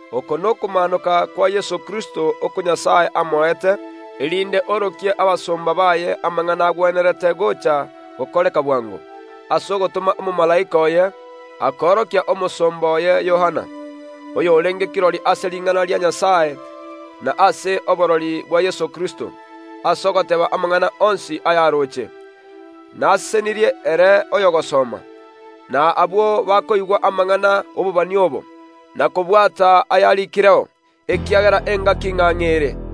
Oko nokomaanoka kwa Yeso Kristo oko Nyasae amoete, erinde arokie abasomba baye amang’ana agwenerete gocha gokoreka bwango. Ase ogotoma omomalaika oye akoorokia omosomba oye Yohana, oyorenge kirori ase ring’ana ria Nyasae na ase oborori bwa Yeso Kristo, ase ogoteeba amang’ana onsi ayaroche. Nare nomogoko ere oyogosoma, na abwo bakoigwa amang’ana obobani obo, na kobwata ayarikireo, ekiagera engaki ng’ang’e ere.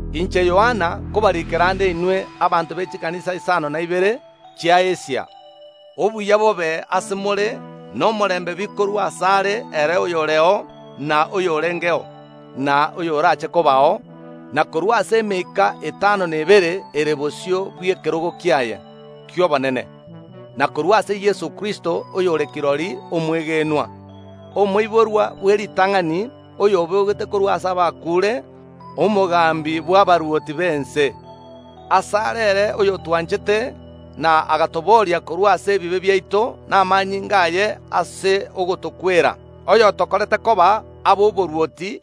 korwa ase Yohana gochia ase chikanisa isano na ibere chi’Asia: Obuya bobe ase more na omorembe bikorwa ase Nyasae ere oyoreo, na oyorengeo, na oyorache kobao, na korwa ase emeika etano na ebere ere bosio bw’ekerogo kiaye ki’obonene, na korwa ase Yeso Kristo, oyore kirori omwegenwa, omoiborwa bw’eritang’ani oyobogete korwa ase abakuure, omogambi bw’abarwoti b’ense. Asare ere oyotwanchete na agatobooria korwa ase ebibe biaito namanyinga aye ase ogotokwera, oyotokorete koba ab’oborwoti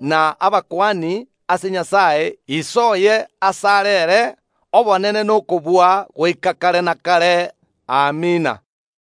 na abakuani ase Nyasae Ise oye asare ere obonene na okobua goika kare na kare. Amina.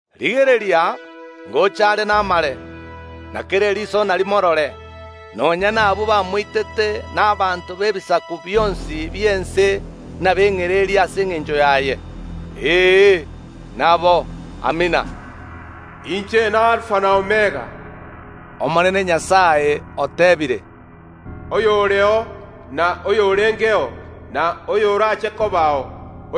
Rigereria, ngocha are namare, na kera eriso narimorore, nonya nabwo bamoitete, na abanto b’ebisaku bionsi bi’ense nabeng’ererie ase engencho yaye. Ee, nabo. Amina. “Inche n’Alifa na Omega,” Omonene oteebire, oyoreo, na oyorengeo, na oyorache kobao.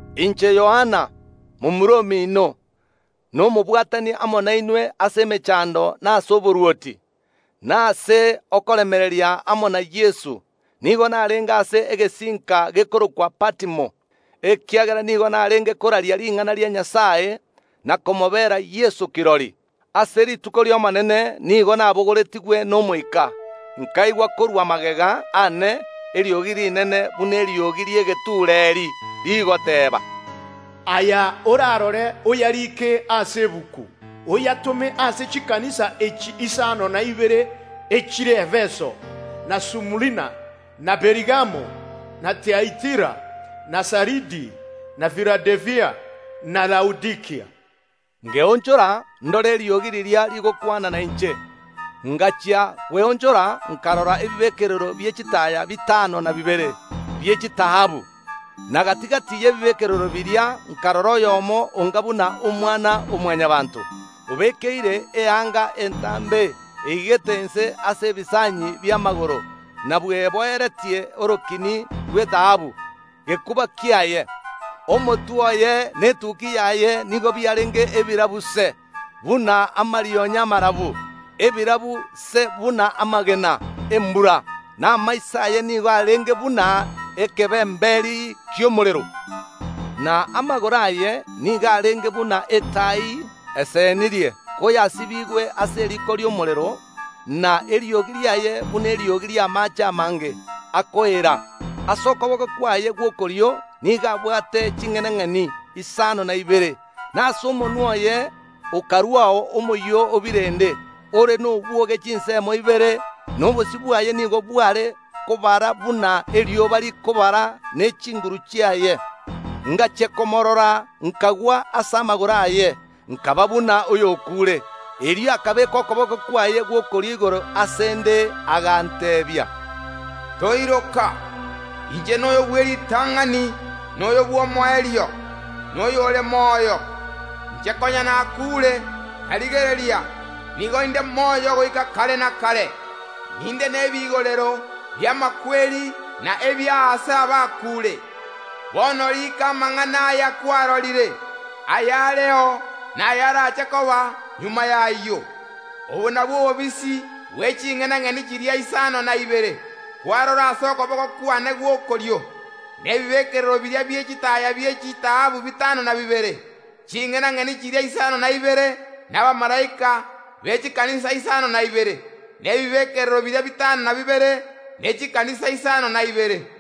Inche Yohana, momura omino, na omobwatani amo nainwe ase emechando, na ase oborwoti, na ase okoremereria amo na Yeso, nigo narenge ase egesinka gekorokwa Patimo, ekiagera nigo narenge koraria ring’ana ria Nyasae na komobera Yeso kirori. Ase rituko ri’Omonene nigo nabogoretigwe n’Omoika, nkaigwa korwa magega aane eriogi rinene, buna eriogi ri’egetureeri, rigoteeba, “Aya orarore oyarike ase egetabu, oyatome ase chikanisa echi isano na ibere echire Efeso, na Sumurina, na Perigamo, na Tiatira, na Saridi, na Filadelfia, na Laodikia.” Nkeonchora ndore eriogi riria rigokwana nainche. Ngachia kweonchora nkarora ebibekerero bie chitaaya bitano na bibere bie chitaabu, na gati‐gati y’ebibekerero biria nkarora oyomo onga buna omwana o Mwanyabaanto, obekeire eanga entambe eigete inse ase ebisanyi bi’amagoro, na bweboeretie orokini rw’etaabu gekuba kiaye. Etukia yaye nigo yarenge endabu se buna amarionya amarabu, ebirabu se buna amagena embura; na amaiso aye nigo arenge buna ekebemberi ki’omorero. Na amagoro aye nigo arenge buna etai esenirie koyasibigwe ase eriko ri’omorero, na eriogi riaye buna eriogi ri’amaache amange akoeera. Ase okoboko kwaye gw’okorio nigo abwate ching’enang’eni isano na ibere, na ase omonwa oye okaruao omoyio o birende ore nobwoge chinsemo ibere, na obosio bwaye nigo bware kobara buna erioba rikobara ne’chinguru chiaye. Ngachia komoorora nkagwa ase amagoro aye, nkaba buna oyokuure. Erio akabeeka okoboko kwaye gw’okorio igoro ase ’nde, aganteebia, Toiroka, inche noyo bw’eritang’ani, na oyo bw’omoerio, na oyore moyo. Inche konya nakuure, na rigereria, nigo inde moyo goika kare na kare, ninde nebigorero bi’amakweri na ebi’aase abakuure. Bono riika amang’ana aya kwarorire, ayareo, na ayarache koba magega y’ayio. Obo nabwo obobisi bwe ching’enang’eni chiria isano na ibere kwarora ase okoboko kwane gw’okorio, na ebibekerero biria bie chitaaya bie chitaabu bitano na bibere: Ching’enang’eni chiria isano na ibere nabamalaika be chikanisa isano na ibere, na ebibekerero biria bitano na bibere nechikanisa isano na ibere.